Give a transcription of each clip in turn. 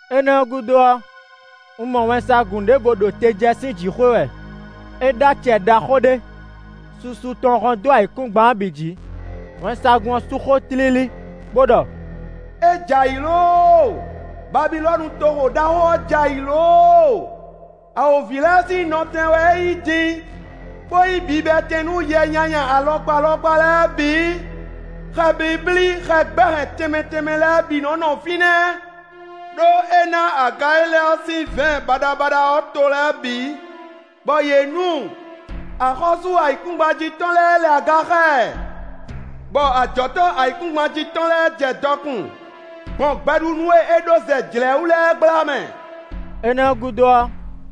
Énɛ́ ɔ́ gúdo ɔ́, un mɔ wɛnsagun ɖěvo ɖo te jɛ sín jǐxwé wɛ. É ɖó acɛ ɖaxó ɖé; susu tɔn hɔ́n dó ayǐkúngban ɔ́ bǐ jǐ. Wɛnsagun ɔ́ sú xó tlílí bó ɖɔ: “É jɛ ayǐ lóóo, Babilɔ́nu toxo ɖaxó ɔ́ jɛ ayǐ lóóo! Awǒvi lɛ́ɛ sín nɔtɛn wɛ é nyí din, bó nyí bibɛtɛn nú yɛ nyanya alɔkpa alɔkpa lɛ́ɛ bǐ; xɛ blíblí, xɛ gbɛ́ hɛn tɛnmɛ tɛnmɛ lɛ́ɛ bǐ nɔ́ nɔ fínɛ́. Đó é ná aga e é lɛ ɔ́ sín vɛ̌ɛn baɖabaɖa ɔ́ to lɛ́ɛ bǐ, bɔ yě nu. Axɔ́sú ayǐkúngban jí tɔn lɛ́ɛ lɛ aga xá ɛ, bɔ ajɔ̌tɔ́ ayǐkúngban jí tɔn lɛ́ɛ jɛ dɔkun gbɔn gbɛɖunú e é ɖó zɛ jlɛ̌ wú lɛ́ɛ gbla mɛ.” Énɛ́ ɔ́ gúdo ɔ́,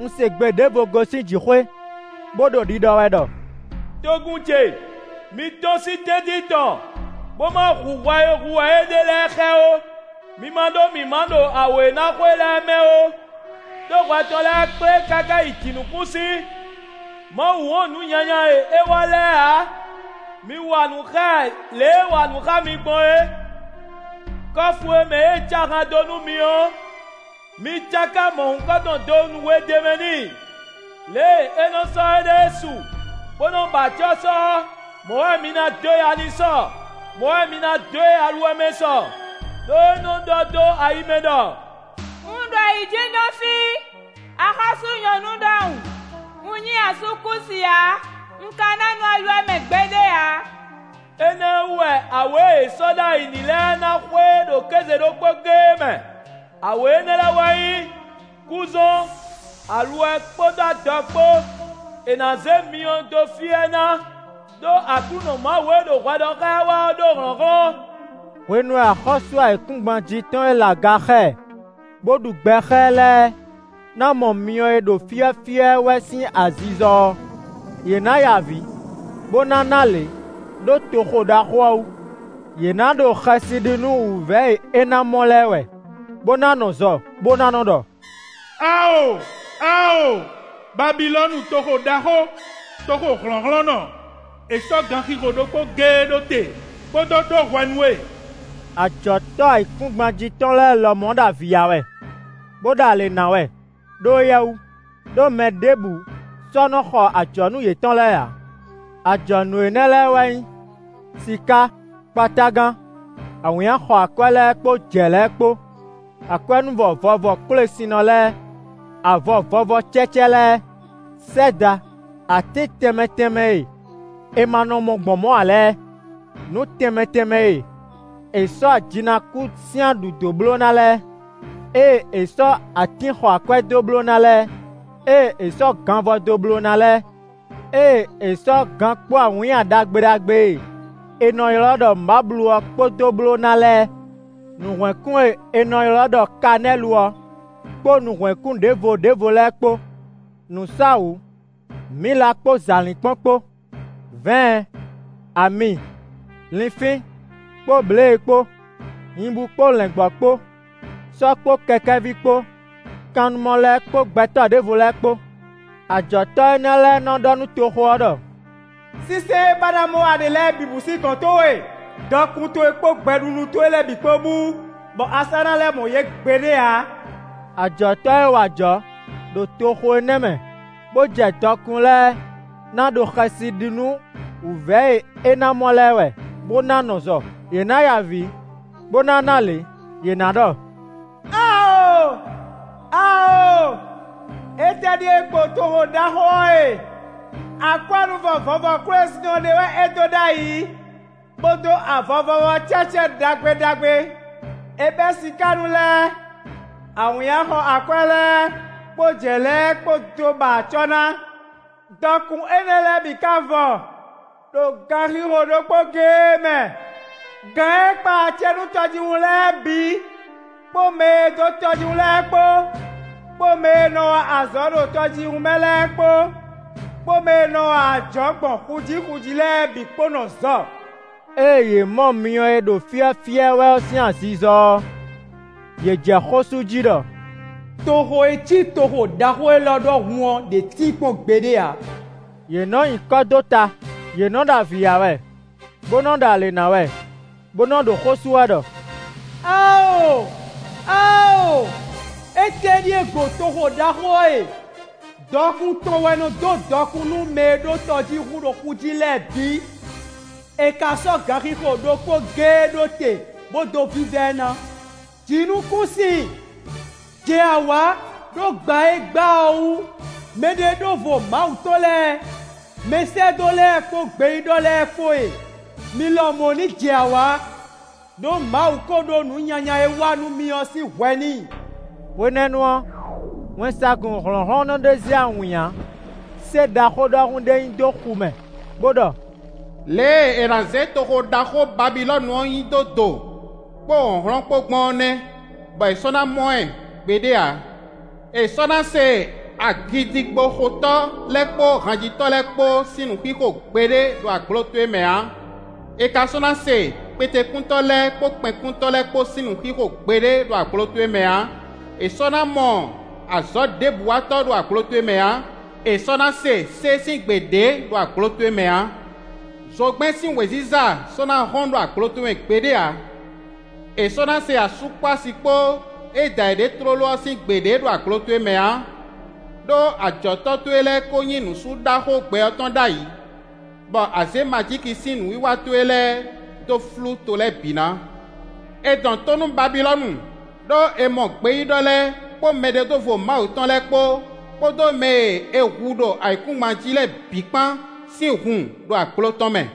un se gbe ɖěvo gosín jǐxwé, bó ɖo ɖiɖɔ wɛ ɖɔ: “Togun ce, mi tɔ́n sín tɛ́ntin tɔn, bó ma hu hwɛ e hu wɛ é ɖe lɛ́ɛ xá ɛ ó, mi ma ɖó mǐmá ɖo awě e ná xo e lɛ́ɛ mɛ ó. Đó hwɛ tɔn lɛ́ɛ kplé káká yi jǐnukúnsin; Mawu wɔn nǔ nyanya e é wa lɛ́ɛ ǎ. Mi wa nǔ xá ɛ lě e é wa nǔ xá mi gbɔn é. Kɔ́fu e mɛ é cá ahan dó nú mi ɔ́, mi cáká mɔ̌hunkɔtɔn donu we d'é mɛ n'i. Lě e é nɔ sɔ́ éɖée su, bó nɔ ba acɔ́ sɔ ɔ́, mɔ̌ wɛ mi ná dó ya n'i sɔ, mɔ̌ wɛ mi ná dó e aluwɛ mɛ sɔ; ɖó é nɔ ɖɔ dó ayi mɛ ɖɔ: ‘Un ɖo ayǐjínjɔ́n fí, axɔ́sú nyɔ̌nu ɖɔhun; un nyí asúkúsi ǎ; un ka ná nɔ aluwɛ mɛ gbeɖé ǎ.’ Énɛ́ ɔ́ wú wɛ awě e è sɔ́ ɖó ayǐ n'i lɛ́ɛ ná xo e ɖo kéze ɖokpó géé mɛ; awě énɛ́ lɛ́ɛ wɛ nyí: kúzɔ́n, aluwɛ kpódó adɔ kpó; è nǎ zě myɔ dó fyɔ́ ɛ ná. Đó Aklúnɔ Mawu e ɖo hwɛ ɖɔ xá ɛ wɛ ɔ́ ɖó hlɔ̌nhlɔ́n.” Hwenu e axɔ́sú ayǐkúngban jí tɔn e lɛ aga xá ɛ, bó ɖu gbɛ xá ɛ lɛ́ɛ ná mɔ myɔ e ɖo fyɔ́fyɔ́ ɛ wɛ ɔ́ sín azizɔ ɔ́, yě ná ya avǐ, bó ná ná alě ɖó toxo ɖaxó ɔ́ wú. Yě ná ɖo xɛsi ɖi nú wǔvɛ́ e é ná mɔ lɛ́ɛ wɛ, bó ná nɔ zɔ, bó ná nɔ ɖɔ: “Awo! Awo! Babilɔ́nu toxo ɖaxó, toxo hlɔ̌nhlɔ́nnɔ! È sɔ́ ganxixo ɖokpó géé ɖó te, bó dó ɖó hwɛ nú we!” Ajɔ̌tɔ́ ayǐkúngban jí tɔn lɛ́ɛ lɔmɔ̌ ɖo avǐ ya wɛ, bó ɖo alě ná wɛ ɖó éyɛ́ wú, ɖó mɛ ɖěbǔ sɔ́ nɔ xɔ ajɔ̌nú yětɔn lɛ́ɛ ǎ. Ajɔ̌nú énɛ́ lɛ́ɛ wɛ nyí: siká, kpatágan, awǐnnya xɔ akwɛ́ lɛ́ɛ kpó jɛ̌ lɛ́ɛ kpó; akwɛ́núvɔ vɔvɔ kwélesinnɔ lɛ́ɛ, avɔ vɔvɔ cɛ́cɛ́ lɛ́ɛ, sɛ́da, atín tɛnmɛ tɛnmɛ e è ma nɔ mɔ gbɔn mɔ̌ ǎ lɛ́ɛ, nǔ tɛnmɛ tɛnmɛ e è sɔ́ ajinakú sín aɖǔ dó bló ná lɛ́ɛ, ée è sɔ́ atín xɔ akwɛ́ dó bló ná lɛ́ɛ, ée è sɔ́ ganvɔ dó bló ná lɛ́ɛ, ée è sɔ́ gan kpó awǐnnya ɖagbe ɖagbe e è nɔ ylɔ́ ɖɔ mǎblu ɔ́ kpó dó bló ná lɛ́ɛ. Nǔhwɛ́nkún e è nɔ ylɔ́ ɖɔ kanɛ́lu ɔ́, kpó nǔhwɛ́nkún ɖěvo ɖěvo lɛ́ɛ kpó; nǔsáwǔ, mǐla kpó zǎlínkpɔ́n kpó; vɛ̌ɛn, ami, linfín, kpó blěe kpó; nyibú kpó lɛ̌ngbɔ́ kpó, sɔ́ kpó kɛkɛ́ví kpó, kannumɔ lɛ́ɛ kpó gbɛtɔ́ ɖěvo lɛ́ɛ kpó. Ajɔ̌tɔ́ énɛ́ lɛ́ɛ nɔ ɖɔ nú toxo ɔ́ ɖɔ: “Sínsɛ́n e ba ná mɔ wɛ a ɖe lɛ́ɛ bǐ bú sín gɔ̌n towe; dɔkun towe kpó gbɛɖunú towe lɛ́ɛ bǐ kpó bú, bɔ a sɔ́ ná lɛ́ mɔ yě gbeɖé ǎ.” Ajɔ̌tɔ́ e wa ajɔ̌ ɖo toxo énɛ́ mɛ bó jɛ dɔkun lɛ́ɛ ná ɖo xɛsi ɖi nú wǔvɛ́ e é ná mɔ lɛ́ɛ wɛ bó ná nɔ zɔ. Yě ná ya avǐ bó ná ná alě. Yě ná ɖɔ: “Awo! Awo! Étɛ́ ɖíe gbo toxo ɖaxó ɔ́ e! Akwɛ́núvɔ vɔvɔ kwélesinnɔ ɖé wɛ é dó ɖ'ayǐ, bó dó avɔ vɔvɔ cɛ́cɛ́ ɖagbe ɖagbe; é bɛ́ sikánú lɛ́ɛ, awǐnnya xɔ akwɛ́ lɛ́ɛ kpó jɛ̌ lɛ́ɛ kpó dó ba acɔ́ ná. Dɔkun énɛ́ lɛ́ɛ bǐ ka vɔ ɖo ganxixo ɖokpó géé mɛ!” Gǎn e kpa acɛ nú tɔjíhún lɛ́ɛ bǐ, kpó mɛ e dó tɔjíhún lɛ́ɛ kpó, kpó mɛ e nɔ wa azɔ̌ ɖo tɔjíhún mɛ lɛ́ɛ kpó, kpó mɛ e nɔ wa ajɔ̌ gbɔn xu jí xu jí lɛ́ɛ bǐ kpó nɔ zɔ. Ée yě mɔ myɔ e ɖo fyɔ́fyɔ́ ɛ wɛ ɔ́ sín azizɔ ɔ́, yě jɛ xó sú jí ɖɔ: “Toxo e cí toxo ɖaxó élɔ́ ɖɔhun ɔ́ ɖě tíin kpɔ́n gbeɖé ǎ!” Yě nɔ nyi kɔ́ dó ta; yě nɔ ɖo avǐ ya wɛ, bó nɔ ɖo alě ná wɛ, bó nɔ ɖo xó sú wɛ ɖɔ: “Awo! Awo! Étɛ́ ɖíe gbo toxo ɖaxó ɔ́ e! Dɔkun tɔn wɛ nɔ dó dɔkun nú mɛ e ɖó tɔjíhún ɖo xu jí lɛ́ɛ bǐ. È ka sɔ́ ganxixo ɖokpó géé ɖó te bó dó vívá ɛ ná.” Jǐnukúnsin! Jɛ awǎ ɖó gba e é gba ɔ́ wú! Mɛɖeɖóvo Mawu tɔn lɛ́ɛ, mɛsɛ́dó lɛ́ɛ kpó gbeyíɖɔ lɛ́ɛ kpó e, mi lɔmɔ̌ ní jɛ awǎ! Đó Mawu ko ɖó nǔ nyanya e é wa nú mi ɔ́ sín hwɛ n'i. Hwenɛ́nu ɔ́, wɛnsagun hlɔ̌nhlɔ́nnɔ ɖé zé awǐnnya sé ɖaxó ɖɔhun ɖé nyi dó xu mɛ bó ɖɔ: “Lě e è nǎ zé toxo ɖaxó Babilɔ́nu ɔ́ nyi dó do, kpó hlɔ̌nhlɔ́n kpó gbɔn ɔ́ nɛ́, bɔ è sɔ́ ná mɔ ɛ gbeɖé ǎ. È sɔ́ ná se agǐdigboxotɔ́ lɛ́ɛ kpó hanjitɔ́ lɛ́ɛ kpó sín nǔxixo gbeɖé ɖo agblo towe mɛ ǎ; è ka sɔ́ ná se kpetekúntɔ́ lɛ́ɛ kpó kpɛnkúntɔ́ lɛ́ɛ kpó sín nǔxixo gbeɖé ɖo agblo towe mɛ ǎ; è sɔ́ ná mɔ azɔ̌ ɖěbǔ watɔ́ ɖo agblo towe mɛ ǎ; è sɔ́ ná se sé sín gbe ɖě ɖo agblo towe mɛ ǎ. Zogbɛ́n sín wěziza sɔ́ ná hɔ́n ɖo agblo towe mɛ gbeɖé ǎ; è sɔ́ ná se asú kpó asi kpó e da yěɖée tlóló ɔ́ sín gbe ɖě ɖo agblo towe mɛ ǎ, ɖó ajɔ̌tɔ́ towe lɛ́ɛ ko nyí nǔsúɖaxó gbɛ ɔ́ tɔn ɖ'ayǐ, bɔ a zě majíki sín nǔwiwa towe lɛ́ɛ dó flú to lɛ́ɛ bǐ ná.” È dɔn tó nú Babilɔ́nu, ɖó è mɔ gbeyíɖɔ lɛ́ɛ kpó mɛɖeɖóvo Mawu tɔn lɛ́ɛ kpó, kpódó mɛ e è hu ɖo ayǐkúngban jí lɛ́ɛ bǐ kpán sín hun ɖo agblo tɔn mɛ.